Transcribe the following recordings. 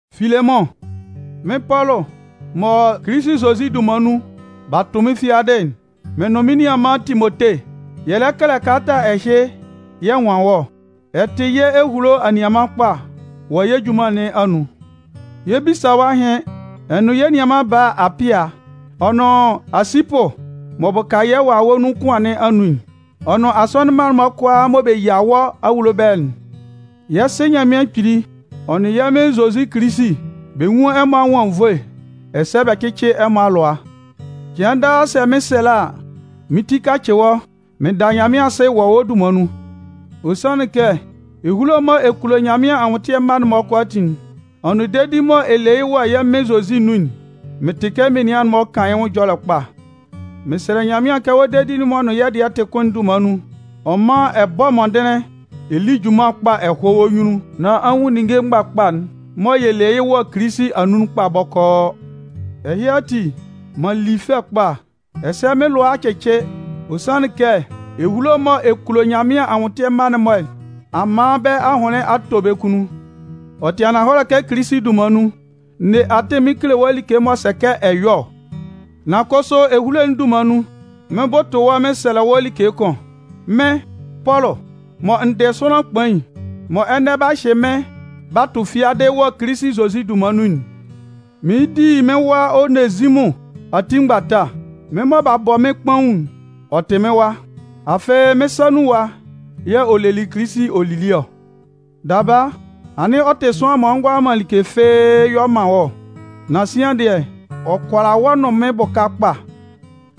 Filemʋn, Mɩ́n Pɔlʋ mɔ Kilisi Zozi dunman nun b'a tʋ mɩ́n fiadɩ'n, mɩn nʋn anianman Timote, yɛ lɛ kɛlɛ kalata ɛhɩ yɛ nwan wɔ́. Ɛ tɩ yɛ́ ehulo anianman kpa wɔ yɛ́ junman nɩn anun. Yɛ 'bisa wɔ́ ahɩn, ɛ nʋn yɛ́ nianman bala Apia, ɔ nʋn Aasipʋ m'ɔ bʋka yɛ́ wawɛ nun kʋan nɩn anun'n, ɔ nʋn asɔnɩn mma'n-mɔ kʋalaa mɔ bɛ yia wɔ́ awulo ɛbɛlɛ'n. Yɛ́ Sɩ Nyanmɩan Kpili ɔ nʋn yɛ́ Mɩn Zozi Kilisi, bɛ nwún ɛmɔ anwʋn anwunnvoe, ɛsɛ bɛ cɩ́cɩ ɛmɔ alʋa. Cɩan daa sɛ mɩn 'sɛlɛ a, mɩ́n ti kacɩ wɔ́, mɩn da Nyanmɩan asɩ wɔ wɔ́ dunman nun. Ɔ sanlɩn kɛ ehulo mɔ ɛ kulo Nyanmɩan anwʋntɩɛ mma'n-mɔ kʋalaatin'n, ɔ nʋn dedi mɔ ɛ le yɩ́ wɔ yɛ́ Mɩn Zozi nun'n, mɩn tɩ kɛ menian'n-mɔ kan yɩ́ nwʋn ɛjɔlɛ kpa. Mɩn sɛlɛ Nyanmɩan kɛ wɔ́ dedi'n m'ɔ nʋn yɛ́ dɩɛ'n tɩ kʋn'n dunman nun, ɔ mán ɛ bɔ́ mɔndɩnlɩn ɛ lí junman kpa ɛ hɔ́ wɔ́ nyunnun, nán a nwun ninnge mgbakpa'n mɔ yɛ le yɩ́ wɔ Kilisi anun'n kpa bɔkɔɔ. Ɛhɩ ati, m'an li fɛ kpa, ɛsɛ mɩ́n lʋa a cɩcɩ ɔ sanlɩn kɛ ehulo mɔ ɛ kulo Nyanmɩan anwʋntɩɛ mma'n-mɔ nɩn a man bɛ́ ahʋnlɩn a tɔ bɛ́ kunnun. Ɔ tɩ ananhɔlɛ kɛ Kilisi dunman nun, n ne atɩn mɩn kele wɔ́ like m'ɔ sɛ kɛ ɛ yɔ́ ɔ, nan kʋsʋ ehulo'n dunman nun, mɩɩn bʋtʋ wɔ́ mɩn sɛlɛ wɔ́ like kʋn. Mɩ́n, Pɔlʋ, mɔ n dɩ sʋanlan kpain, mɔ ɛnɛ b'a hyɩ mɩ́n b'a tʋ fiadɩ wɔ Kilisi Zozi dunman nun'n, mɩɩn di mɩ́n wa Onezimʋn ati mgbata. Mɩ́n mɔ b'a bɔ mɩ́n kpaun'n, ɔ tɩ mɩ́n wa. Afɩ, mɩ́n sa nun ɛwa yɛ̂ ɔ'a le Kilisi ɔ'a li ɔ. Daba, anɩn ɔ tɩ sʋanlan m'ɔ ngʋala man like fɩ́ɩ́ yɔ man wɔ́ ɔ. Nan sian dɩɛ, ɔ kʋala wɔ́ nʋn mɩ́n bʋka kpa.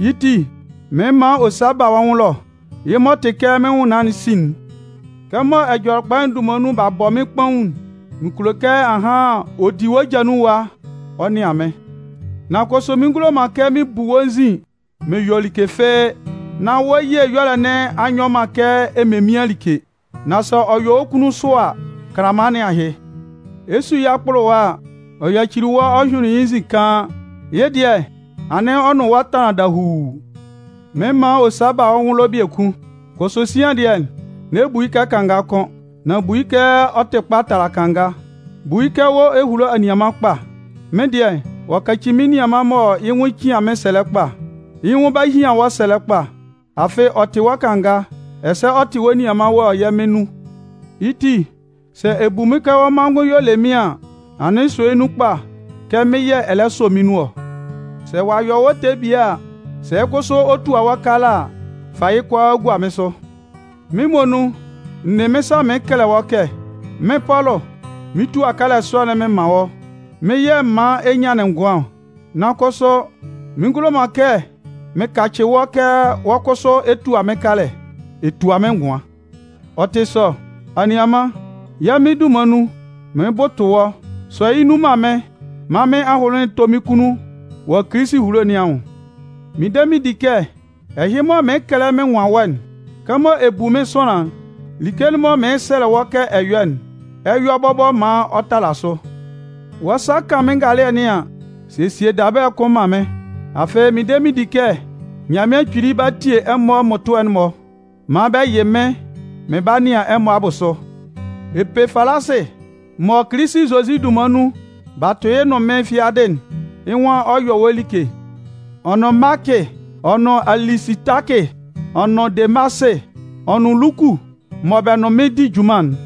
Yɩ́ ti, mɩɩn man ɔ sa ba wɔ́ nwʋn ɛlɔ, yɩ́ m'ɔ tɩ kɛ mɩ́n nwʋnnaan'n sin'n. Kɛmɔ Ɛjɔlɛkpa'n dunman nun b'a bɔ mɩ́n kpaun'n, mɩn kulo kɛ ahan ɔ di wɔ́ ja nun ɛwa ɔ nɩan mɩ́n. Nan kʋsʋ mɩn ngulo man kɛ mɩn bu wɔ́ nzin mɩn yɔ like fɩ́ɩ́, nán wɔ́ ye ɛyɔlɛ nɩn a nyɔ man kɛ ememian like. Nan sɛ ɔ yɔ wɔ́ kunnun sʋ a, kanlanman nɩn ahɩ. Ɛ 'su yɩ́ akpʋlʋwa a, ɔ yacili wɔ́ ɔ hyʋɩnlɩn yɩ́ nzin kaan, yɩ́ dɩɛ, anɩn ɔ nʋn wɔ́ tanlan dahuu. Mɩɩn man ɔ sa ba wɔ́ nwʋn ɛlɔ biekun. Kʋsʋ sian dɩɛ, n'ɛ bu yɩ́ kɛ kanga kʋ́n, nan bu yɩ́ kɛ ɔ tɩ kpa tala kanga, bu yɩ́ kɛ wɔ́ ehulo anianman kpa. Mɩ́n dɩɛ, ɔ'a kaci mɩ́n nianman mɔ yɩ́ nwʋn cian mɩ́n sɛlɛ kpa. Yɩ́ nwʋn 'ba hian wɔ́ sɛlɛ kpa, afɩ ɔ tɩ wɔ́ kanga, ɛsɛ ɔ tɩ wɔ́ nianman wɔ yɛ́ Mɩn nun. Yɩ́ ti, sɛ ɛ bu mɩ́n kɛ wɔ́ manngʋn y'ɔ le mɩ́n an, anɩn sɔ yɩ́ nun kpa kɛ mɩ́n yɛ̂ ɛ lɛ sɔ mɩ́n nun ɔ. Sɛ ɔ'a yɔ wɔ́ ɛtɛ bie a, sɛ kʋsʋ ɔ tua wɔ́ kalɛ a, fa yɩ́ kʋalaa gua mɩ́n sʋ. Mɩ́n muonun, n ne mɩ́n sa mɩɩn kɛlɛ wɔ́ kɛ: Mɩ́n Pɔlʋ, mɩn 'tua kalɛ sɔ'n mɩn man wɔ́. Mɩ́n yɛ̂ m man ɛ nyanlɩn ngʋan ɔ, nan kʋsʋ mɩn ngulo man kɛ mɩn kacɩ wɔ́ kɛ wɔ́ kʋsʋ ɛ tua mɩ́n kalɛ, ɛ tua mɩ́n ngʋan. Ɔ tɩ sɔ, anianman, yɛ́ Mɩn dunman nun, mɩɩn bʋtʋ wɔ́, sɔ yɩ́ nun man mɩ́n maan mɩ́n ahʋnlɩn tɔ́ mɩ́n kunnun wɔ Kilisi ehulo nɩn anwʋn. Mɩn de mɩn di kɛ ɛhɩ mɔ mɩɩn kɛlɛ mɩn nwan wɔ́'n, kɛmɔ ɛ bu mɩ́n sʋanlan'n, like'n mɔ mɩɩn sɛlɛ wɔ́ kɛ ɛ yɔ́'n, ɛ 'yɔ bɔbɔ maan ɔ tala sʋ. Wɔ́ sa kan mɩ́n ngalɩɛ nɩn an, sesie dabɛlɛ kʋn man mɩ́n. Afɩ, mɩn de mɩn di kɛ Nyanmɩan Kpili 'ba tie ɛmɔ mmʋtʋɛ'n-mɔ maan bɛ yɩ mɩ́n mɩn 'ba nɩan ɛmɔ abʋsʋ. Epafalasɩ mɔ Kilisi Zozi dunman nun b'a tʋ yɩ́ nʋn mɩ́n fiadɩ'n, yɩ́ nwan ɔ 'yɔ wɔ́ like, ɔ nʋn Maakɩ, ɔ nʋn Alisitakɩ, ɔ nʋn Demasɩ, ɔ nʋn Luku, mɔ bɛ nʋn mɩ́n di junman'n.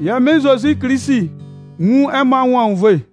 Yɛ́ Mɩn Zozi Kilisi nwún ɛmɔ anwʋn anwunnvoe.